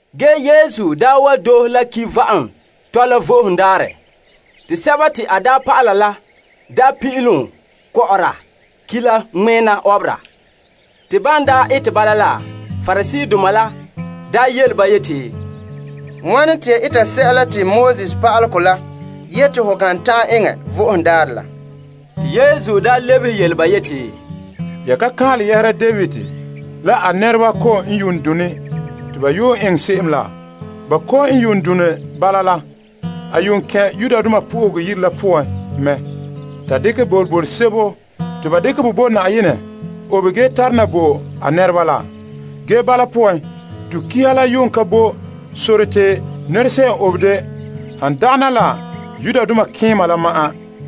Ge Yesu daa wa doohe la ki' va'am dɔla Vo'ohogo Daarɛ, te a dɔlɔba la daa pin'ilom kɔ'ɔra ki' la ŋmɛna ɔbera. Te ban ete bala la, Pariseedoma la daa yele ba yeti, Wane te ya eta sɛla te Pa'alegɔ la yete ho kan ta'an eŋɛ Vo'ohogo Daarɛ? Te Yesu lebehe yele ba yeti, Ya ka kaanlɛ yɛhera David la a nɛreba kom yuun done te a yuun eŋɛ se'em laa? Ba kom n yuun done bala la, a yuun kɛn' Yenɛ yire la poan mɛ ta dekɛ toolom boroboro sebo te ba dekɛ bo Na'ayenɛ obe ge tare na bo a nɛreba la. Ge bala poan to kiha la yuun ka bo sore te nɛra se'em obe de han dagana la malemadaana la ma'an.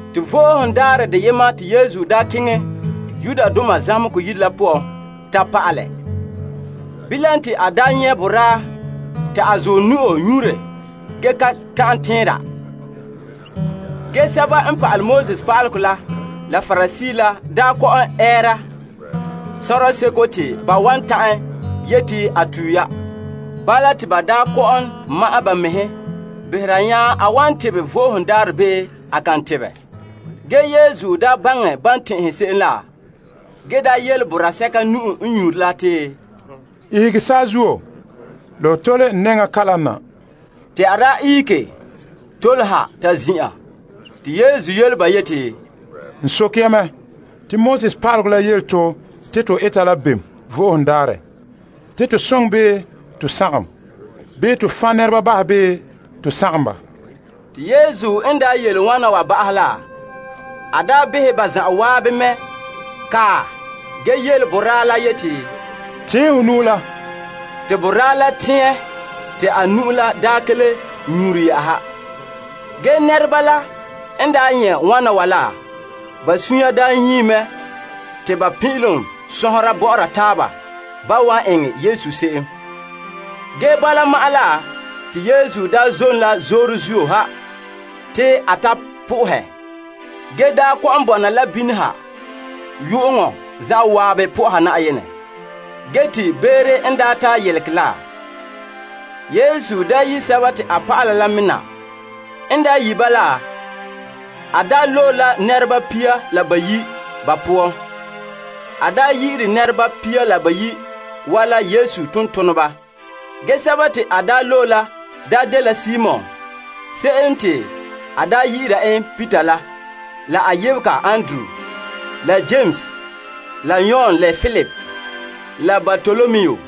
Te Vo'ohogo Daarɛ deyema te Yesu daa keŋɛ zamehegɔ yire la poan ta pa'alɛ. Bilam te a daa nyɛ' boraa ta a zuɔ nu'o nyure ge ka tana tɛnra. Ge pa'alegɔ pa'aleba la, la Pariseedoma la daa kɔ'ɔn ɛɛra sɔrɔɔ seko te ba wan ta'an yete a tue ya. Bala te ba daa kɔ'ɔn ma'ɛn ba mɛhe behera nya a wan tebɛ Vo'ohogo Daarɛ bii a kan tebɛ. Ge Yesu baŋɛ ban tɛn'ɛhere se'em la, ge yele boraa sɛka nu'o n nyure la te, Ihege saazuo la ho tole n nɛŋa kalam na. Te a ihege tole ha ta ze'a. Te Yesu yele ba yeti, N soke ya mɛ, te Pa'alegɔ la yele to te to eta la bem Vo'ohogo Daarɛ? Te to soŋɛ bii to sagom? Bii to fan' nɛreba bahɛ bii to sagom ba? Te Yesu n yele wan wa ba'ahɛ la, a behɛ ba zan'an mɛ kae ge yele boraa la yeti, Tɛɛn ho nu'o la. Te boraa la tɛɛn te a nu'o la ka le nyure yɛ'ɛha. Ge nɛreba la n nyɛ' wana wa la, ba sunsunya nyie mɛ te ba pin'ilom sɔnhera bɔ'ɔra taaba ban wan eŋɛ Yesu se'em. Ge bala ma'an la te Yesu daa zom la zoore zuo ha te a ta sohɛ Yenɛ, ge kɔ'ɔn bɔna la bini ha yu'uŋɔ zan'an soha Yenɛ. Ge te beere n ta yelegɛ la, Yesu yi' a dɔlɔba la mɛ na. N yi' ba la, a loe la nɛreba pia la bayi' ba poan. Yesu yi'ire nɛreba pia la bayi' wa la a tontoneba. Ge sɛba te a loe la dela Simon se'em te a daa yi'ira en Peter la la a yebega Andrew, la Yames, la Yon la Filip, la Bartolomu,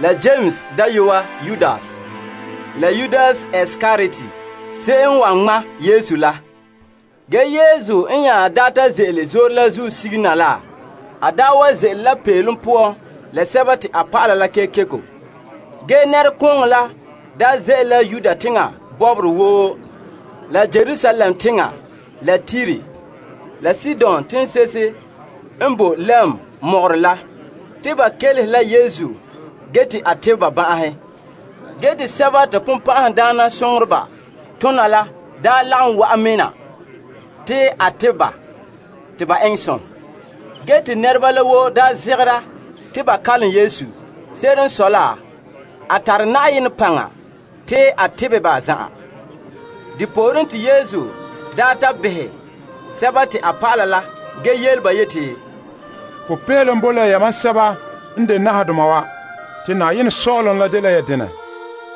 la Yames dayɔa Yudas, la Yudas Iskariot se'em n wan ŋma' Yesu la. Ge Yesu n nya daa ta ze'ele zoore la zuo sige na la na, a wa ze'ele la peelom poan Yesu la a dɔlɔba la kekeko. Ge nɛrekooŋɔ ze'ele Yudea teŋa bɔbɔre woo, la Yerusalem teŋa la Tire, la Sidon teŋse'ehe n boe lɛm mɔgɔrɛ la te ba kelehe la Yesu ge te a tebɛ ba ban'ahe. Ge te sɛba te bonbɛ'ɛhe tona la daa lagom wa'an me na te a tebɛ ba te ba eŋɛ som. Ge te nɛreba la woo zegera te ba kalom Yesu. Se'ere n sɔe la, a tare Na'ayenɛ paŋa te a tebɛ ba zan'an. Depooren te Yesu daa ta behɛ a dɔlɔba la ge yele ba yeti, Popeelom boe la yamam sɛba n de nahadoma wa, te Na'ayenɛ Sɔ'ɔlom la dela ya denɛ.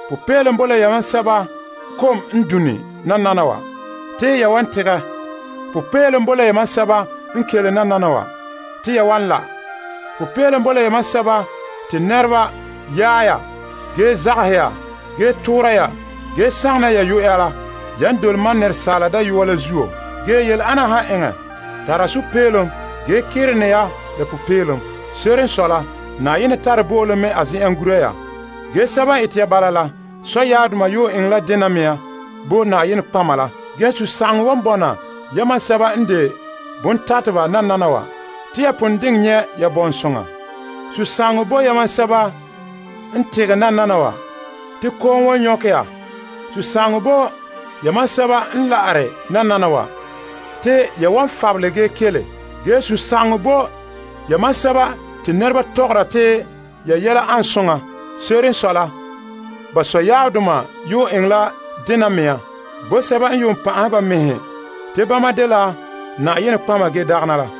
Popeelom boe la yamam sɛba kom n done nananawa, te ya wan tegɛ. Popeelom boe la yamam sɛba n kele nananawa, te ya wan la'. Popeelom boe la yamam sɛba te nɛreba yaɛ ya ge zagaha ya ge toora ya ge sagona ya yuya la, yan dole Asaala Dayɔa la zuo la. Ge yele ana han eŋɛ ya, tara sunpeelom ge kerene ya la popeelom. Se'ere n sɔe la, Na'ayenɛ tare bo'olom mɛ a zen'en gura ya. Ge sɛba n ete ya bala la sɔyaabdoma yuun eŋɛ la dena mea bo nɔtɔgɔheba la. Ge sunsagaŋɔ wan bɔna yamam sɛba n de bontateba nananawa, te ya pon diŋɛ nyɛ' ya bɔŋsoŋa. Sunsagaŋɔ boe yamam sɛba n tegɛ nananawa, te kom wan nyɔkɛ ya. Sunsagaŋɔ boe yamam sɛba n la'are nananawa, te ya wan fabelɛ ge kele. Ge sunsagaŋɔ boe yamam sɛba te nɛreba tɔgɔra te ya yɛla an soŋa. Se'ere n sɔe la, ba sɔyaabdoma yuun eŋɛ la denɛ mea bo sɛba n yuun pan'ahɛ ba mɛhe te bama dela nɔtɔgɔheba ge dagɛna la.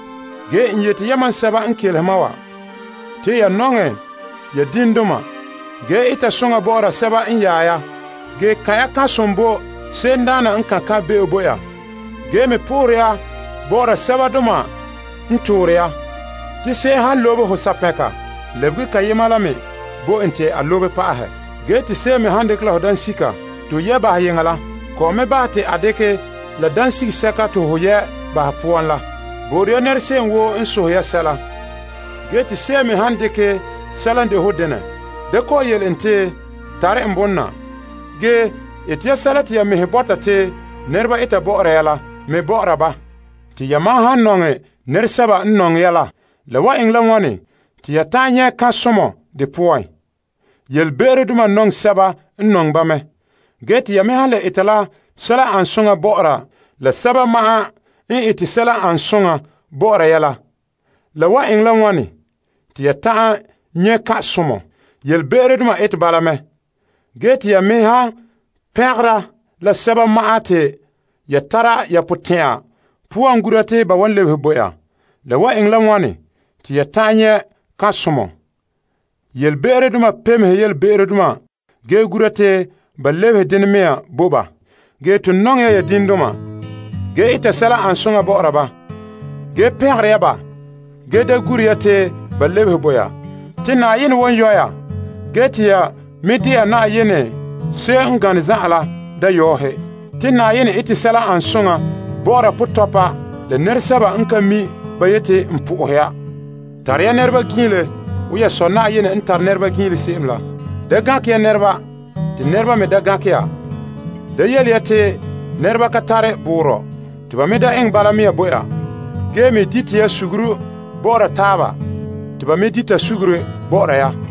Ge n yete yamam sɛba n kelehere ma wa te ya nɔŋɛ ya diŋdoma ge eta sɛla n an soŋa bɔ'ɔra sɛba n yaɛ ya. Ge kan' ya kan'somɔ bo se'emdaana n kan' kan' be'em bo ya, ge me sohore ya Yenɛ bo'ore ya sɛbadoma n toore ya. Te se'em han lobe ho sapɛnka, lebege deyema la me bo en te a lobe pa'ahɛ. Ge te se'em me han dekɛ la ho banaa te ho yɛ' bahɛ yeŋa la, kɔ'ɔn me bahɛ te a dekɛ la dansisɛka te ho yɛ' bahɛ poan la. Bo'ore ya nɛra se'em woo n sohɛ ya sɛla ge te se'em me han dekɛ sɛla n de ho denɛ, da kɔ'ɔn yele en te, Tare n bonɔ na. Ge ete ya sɛla te ya mɛhe bɔta te nɛreba eta bɔ'ɔra ya la me bɔ'ɔra ba. Te yamam han nɔŋɛ la nɛresɛba ma'an n nɔŋɛ ya la, la wan eŋɛ la wane te ya ta'an nyɛ' kan'somɔ de poan? Ge yelebe'erodoma nɔŋɛ sɛba n nɔŋɛ ba mɛ. Ge te ya me han le eta la sɛla n an soŋa bɔ'ɔra la sɛba ma'an n ete sɛla n an soŋa bɔ'ɔra ya la, la wan eŋɛ la wane te ya ta'an nyɛ' kan'somɔ? Ge yelebe'erodoma ete bala mɛ. Ge te ya me han pengera la sɛba ma'an te ya tara ya potɛn'ya poan gura te ba wan lebehe bo ya, la wan eŋɛ la wane te ya ta'an nyɛ' kan'somɔ? Ge yelebe'erodoma pemehe yelebe'erodoma ge gura te ba lebehe denɛ mea bo ba. Ge ton nɔŋɛ ya ya diŋdoma ge ete ya sɛla n an soŋa bɔ'ɔra ba. Ge peŋegere ya ba ge da gure ya te ba lebehe bo ya. Te Na'ayenɛ wan yɔ' ge te ya me wan de'a Na'ayenɛ se'em n gane zan'an la dayɔɔhe. Te Na'ayenɛ ete sɛla n an soŋa bɔ'ɔra potɔpa la nɛresɛba n ka mi' ba yeti, N po'ohe ya. Zote ya nɛreba ninbɔn'ɔn wo ya Sɔ' Na'ayenɛ n zote ya ninbɔn'ɔn se'em la. Da gankɛ ya nɛreba te Yenɛ me da gankɛ ya. Da yele ya te nɛre'ena ka tare boorɔ, te Yenɛ me da eŋɛ bala mea bo ya. Ge me dite ya suguru bɔ'ɔra taaba te Yenɛ me bahɛ ya be'em bo ya.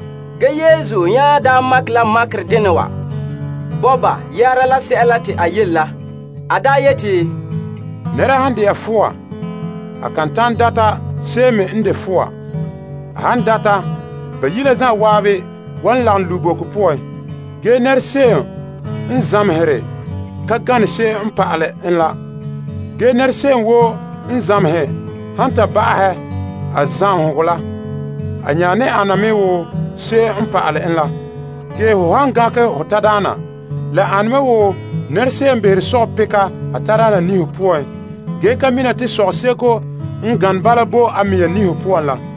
Ge Yesu nya daa makɛ la makɛ dena wa bo ba yɛhera sɛla te a yele la. A yeti, Nɛra han de'a fɔa, a kan nyaŋɛ data se'em me n de fɔa. A han data, ba bayi' la zan'an wan lagom lu' boko poan. Ge nɛra se'em n zamehere ka gane se'em n pa'alɛ en la. Ge nɛra se'em woo n zamehere han ta ba'ahɛ a zamehegɔ la, a nya ane me wo se'em n pa'alɛ en la. Ge ho han gankɛ ho tadaana la ane me wo nɛra se'em n behere sɔgɔpika a tadaana niho poan ge ka mina te sɔgɔseko n gane bala boe a mɛŋa niho poan la.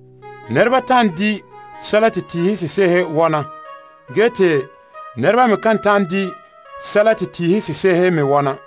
Nɛreba ta'an di' sɛla te tiihe sese'ehe wɔna. Ge te nɛreba me kan ta'an di' sɛla te tiihe sese'ehe me wɔna.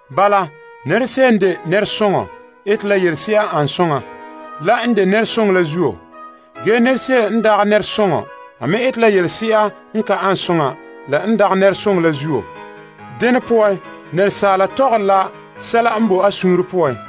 Bala, nɛra se'em n de nɛresoŋɔ ete la yelese'a n ane soŋa la n de nɛresoŋɔ la zuo. Ge te nɛra se'em n dagɛ nɛresoŋɔ me ete la yelese'a n ka ane soŋa la n dagɛ nɛresoŋɔ la zuo. Dene poan nɛresaala tɔgɔre la sɛla n boe a suunre poan.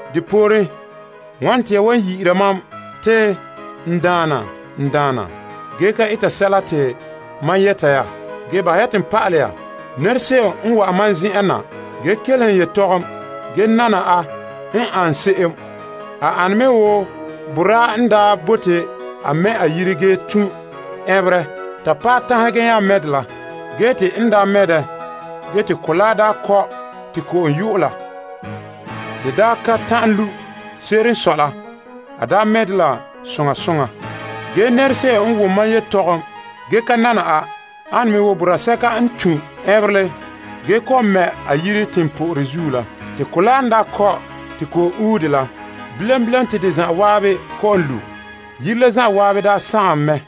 Depooren, wane te ya wan yi'ira mam te, N Daana, n Daana, ge ka eta sɛla te ma yɛta ya? Ge bahɛ ya te n pa'alɛ ya nɛra se'em n wa'an ma zen'en na ge kelehe n yetɔgom ge nana a n an se'em. A ane me wo boraa n daa bote a mɛ' a yire ge tun' ɛnberɛ ta paɛ tanhe ge nya mɛ' dɛ la. Ge te n mɛ' dɛ ge te kolaa daa kɔ' te ko'om ue la, de daa ka ta'an lu'. Se'ere n sɔe la, a mɛ' dɛ la soŋa soŋa. Ge nɛra se'em n wom mam yetɔgom ge ka nana a ane me wo boraa sɛka n ka tun' ɛnberɛ ge kɔ'ɔn mɛ' a yire teŋpo'orɛ zuo la. Te kolaa n kɔ' te ko'om ue dɛ la, bilam bilam te de zan'an kɔ'ɔn lu'. Yire la zan'an sagom mɛ.